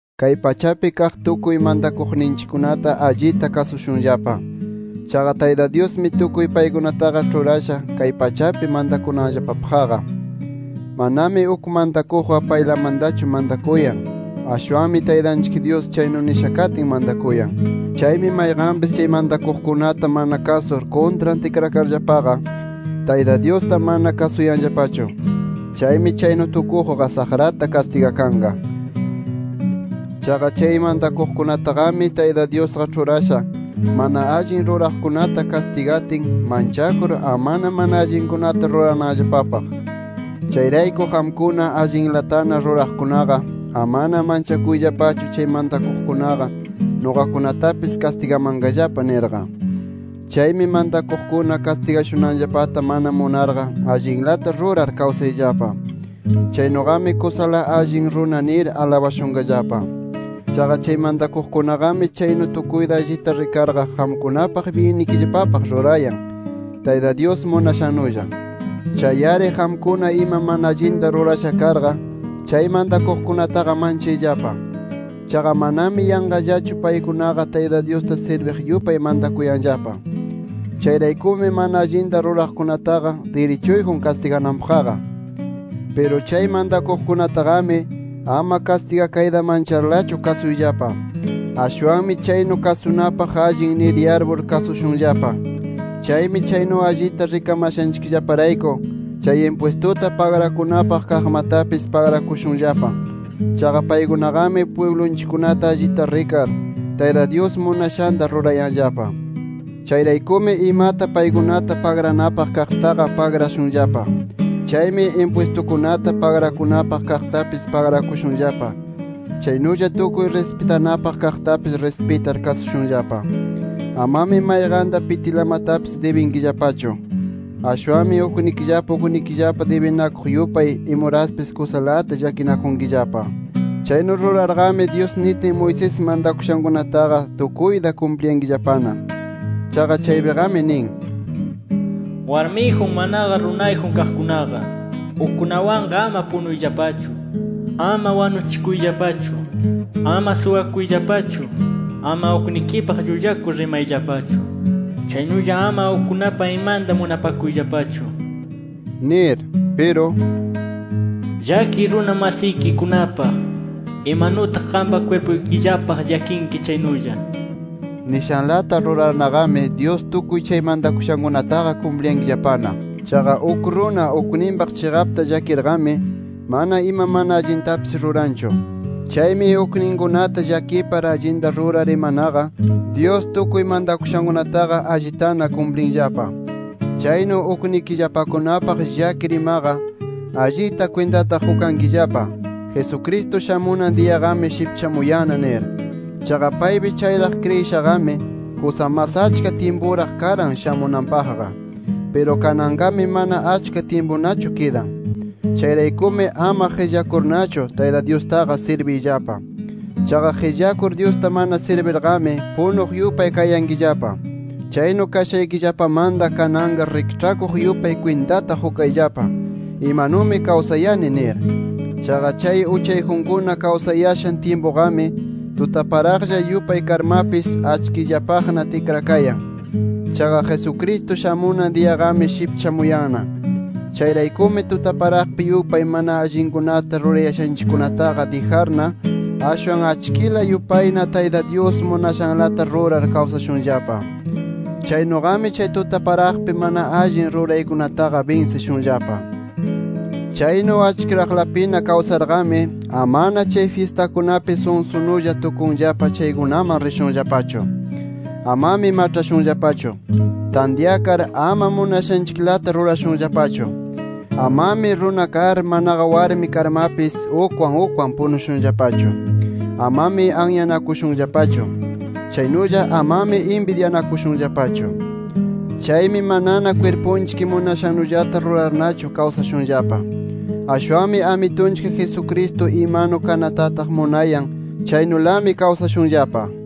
Kay pachapi kaq tukuy mantakuqninchikkunata allita kasushunllapa. Chaqa Tayta Dyusmi tukuy paykunataqa ĉhurasha kay pachapi mantakunanllapapaqqa. Manami uk mantakuqqa payllamantachu mantakuyan. Ashwanmi Taytanchik Dyus chaynu nisha katin mantakuyan. Chaymi mayqanpis chay mantakuqkunata mana kasur, kuntran tikrakarllapaqa Tayta Dyusta mana kasuyanllapachu. Chaymi chaynu tukuqqa saqrata kastigakanqa. Chaqa chay mantakuqkunataqami Tayta Dyusqa ĉhurasha, mana allin ruraqkunata kastigatin, manchakur ama mana allinkunata rurananllapapaq. Chayrayku qamkuna allinlatana ruraqkunaqa, amana manchakuyllapachu chay mantakuqkunaqa nuqakunatapis kastigamanqallapa nirqa. Chaymi mantakuqkuna kastigashunanllapata mana munarqa allinlata rurar kawsayllapa. Chaynuqami kusala allin runa nir alabashunqallapa. Chaqa chay mantakuqkunaqami chaynu tukuyta allita rikarqa qamkunapaq byinnikillapapaq rurayan, Tayta Dyus munashannulla. Chay-ari qamkuna ima mana allinta rurasha karqa, chay mantakuqkunataqa manchayllapa. Chaqa manami yanqallachu paykunaqa Tayta Dyusta sirbiq yupay mantakuyanllapa. Chayraykumi mana allinta ruraqkunataqa, dirichuyjun kastigananpaqqa. Piru chay mantakuqkunataqami, ama kastigakayta mancharlachu kasushunllapa. Ashwanmi chaynu kasunapaq allin nir yarpur kasushunllapa. Chaymi chaynu allita rikamashanchikllaparayku, chay impwistuta pagrakunapaq kaqmatapis pagrakushunllapa. Chaqa paykunaqami pwiblunchikkunata allita rikar, Tayta Dyus munashanta rurayanllapa. Chayraykumi imata paykunata pagranapaq kaqtaqa pagrashunllapa. Chaymi impwistukunata pagrakunapaq kaqtapis pagrakushunllapa. Chaynulla tukuy rispitanapaq kaqmatapis rispitar kasushunllapa. Amami mayqanta pitilamatapis dibinkillapachu. Ashwanmi uknikillapa uknikillapa dibinakuq yupay imuraspis kusalata llakinakunkillapa. Chaynu rurarqami, Dyus nitin Moisés mantakushankunataqa tukuyta kumpliyankillapana. Chaqa chaypiqami nin: “Warmiyjun manaqa runayjun kaqkunaqa, ukkunawanqa ama punuyllapachu. Ama wanuchikuyllapachu; ama suwakuyllapachu; ama uknikipaq llullakur rimayllapachu. Chaynulla ama ukkunapa imanta munapakuyllapachu” nir. Piru “Llakiy runa masikikunapaq, imanutaq qampa kwirpuykillapaq llakinki chaynulla” nishanlata rurarnaqami Dyus tukuy chay mantakushankunataqa kumpliyankillapana. Chaqa uk runa ukninpaq chiqapta llakirqami, mana ima mana allintapis ruranchu. Chaymi ukninkunata llakipar allinta rurar imanaqa Dyus tukuy mantakushankunataqa allitana kumplinllapa. Chaynu uknikillapakunapaq llakir imaqa, allita kwintata qukankillapa: Jesucristo shamunan diyaqami shipchamuyanna nir. Chaqa paypi chayraq kriyishaqami, kusa mas achka tyimpuraq karan shamunanpaqqa. Piru kananqami mana achka tyimpunachu kidan. Chayraykumi ama qillakurnachu Tayta Dyustaqa sirbiyllapa. Chaqa qillakur Dyusta mana sirbirqami, punuq yupay kayankillapa. Chaynu kashaykillapamanta kananqa rikĉhakuq yupay kwintata qukayllapa: Imanumi kawsayani nir. Chaqa chay uchayjunkuna kawsayashan tyimpuqami tutaparaqlla yupay karmapis, achkillapaqna tikrakayan. Chaqa Jesucristo shamunan diyaqami shipchamuyanna. Chayraykumi, tutaparaqpi yupay mana allinkunata rurayashanchikkunataqa dijarna, ashwan achkila yupayna Tayta Dyus munashanlata rurar kawsashunllapa. Chaynuqami, chay tutaparaqpi mana allin ruraykunataqa binsishunllapa. Chaynu achkiraqlapina kawsarqami, amana chay fyistakunapi sunsunulla tukunllapa chaykunaman rishunllapachu. Amami maĉhashunllapachu. Tantyakar ama munashanchiklata rurashunllapachu. Amami runa kar, manaqa warmi karmapis ukwan ukwan punushunllapachu. Amami anyanakushunllapachu. Chaynulla amami inbidyanakushunllapachu. Chaymi manana kwirpunchik munashannullata rurarnachu kawsashunllapa. Ashwanmi Amitunchik Jesucristo imanu kanatataq munayan, chaynulami kawsashunllapa.